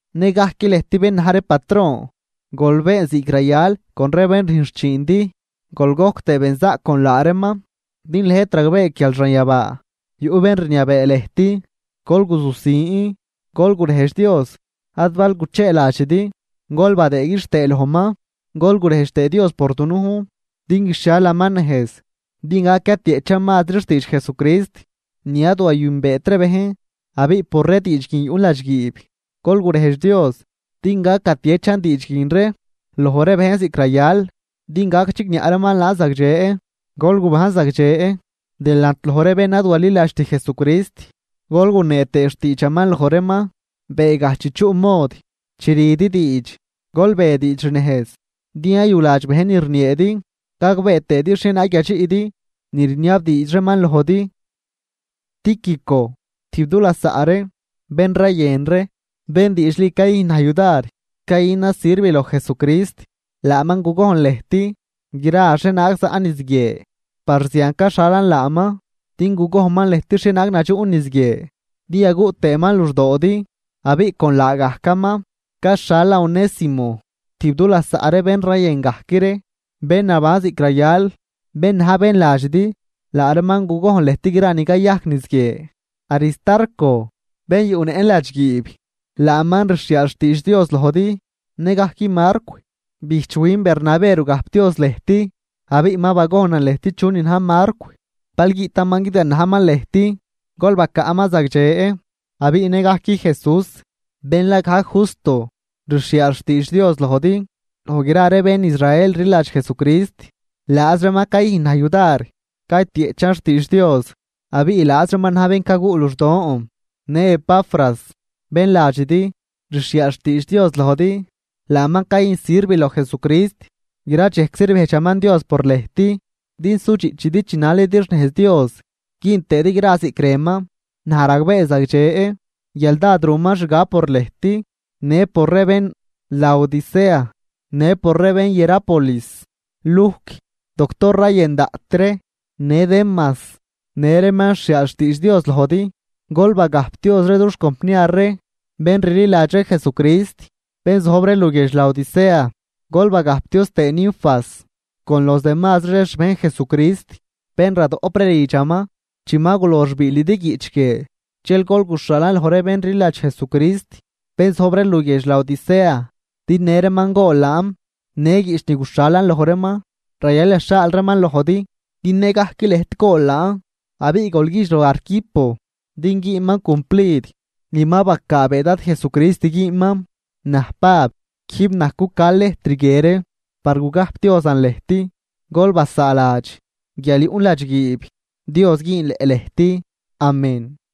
Nëgajc lëjt bén na̱j ree patron, gol been ziꞌc rayal con ree bén rüjn xchiindi, gol gojc tëë benzaꞌc con laa reeman, din lëjt ragbee guial xanyabaa yuꞌ bén rniabee lëjt. Gol guzusin, gol gurejdx Dios ad bal gucheeladxidi, gol badëë quixtëë lojman. Gol gurejdx tëë Dios por dunujn din guixhialaman nejz din gac yatieꞌchan mazri xtiidx Jesucrist ni ad wayünbeet ree bejn. Abiꞌ por ree diidx guin yuꞌn ladxguiib. Gol gurejdx Dios din gac gatiechan diidx guin ree loj ree bejn ziꞌc rayal din gac chigniaꞌ reeman laan zagdxe. Gol gubajn zagdxe delant loj ree bén ad waliladxt Jesucrist gol gunee tëë xtiidxaman loj reeman beegaj chi chuꞌ mod. Chi rüdi diidx, gol be diidx xnejz din yayuladx bejn ni rnieedi gagbee tëëdi xhienaag yadxiꞌdi ni rniabdiidx reeman lojdi. Tíquico, tijb du lasaꞌ ree, bén rayën ree, bén diidxli cayüjn naj yudar cayünan sirv loj Jesucrist, laaman gugojn lëjt gra xhienaag zaꞌn niz guie. Par zian caxhalan laaman din gugojnman lëjt xhienaag nadxuꞌn niz guie din yaguꞌ tëëman luxdoodi. Abiꞌ con laagajcaman caxhalan Onésimo, tijb du lasaꞌ ree bén rayën gajc ree, bén naban ziꞌc rayal, bén na̱j bén ladxidi. Laa reeman gugojn lëjt gra ni cayajc niz guie. Aristarco, bén yuꞌnëꞌn ladxguiib, laaman rxhiaal xtiidx Dios lojdi. Nëgajc Marcw, bijchwin Bernabé rugajpdioz lëjt. Abiꞌ ma bagojnan lëjt chunin na̱j Marcw, bal guiꞌtaman guidganajman lëjt, gol bacaꞌman zagdxe. Abiꞌ nëgajc Jesús, bén la gajc Justo, rxhiaal xtiidx Dios lojdi. Loj gra ree bén Israel rliladx Jesucrist, laaz reeman cayüjn na̱j yudar caytieꞌchan xtiidx Dios abiꞌ laaz reeman na̱j bén caguꞌ luxdon. Në Epafras, bén ladxidi, rxhiaal xtiidx Dios lojdi. Laaman cayüjn sirv loj Jesucrist. Gra dxejczi rbejdxaman Dios por lëjt din sudxiꞌchidi chinalidi xnejz Dios güün tëëdi gra ziꞌc rënman. Naj ragbee zagdxe guial dád ruman xgab por lëjt, në por ree bén Laodicea, në por ree bén Hierápolis. Lujc, doctor rayën daꞌt ree, në Demas, në reeman rxhiaal xtiidx Dios lojdi. Gol bagajpdioz ree dux compniar ree bén rliladx ree Jesucrist, bén zojb ree luguiedx Laodicea. Gol bagajpdioz tëë Ninfas con los demazri ree xbejn Jesucrist bén radoꞌp ree lidxaman. Chi ma gulox biilidi guiꞌch guie, dxel gol guxhaalan loj ree bén rliladx Jesucrist, bén zojb ree luguiedx Laodicea, din në reeman gool laan. Në guiꞌch ni guxhalan loj reeman rayal yaxhaal reeman lojdi din nëgajc lëjt gool laan. Abiꞌ gol güjdx loj Arquipo din güünman cumplid ni ma bacaabee Dad Jesucrist güünman. Naj Pab, quijb naj cuca lejtr guie ree par gugajpdiozan lëjt. Gol basaaladx guial yuꞌn ladxguiib. Dios güünleꞌ lejt. Amén.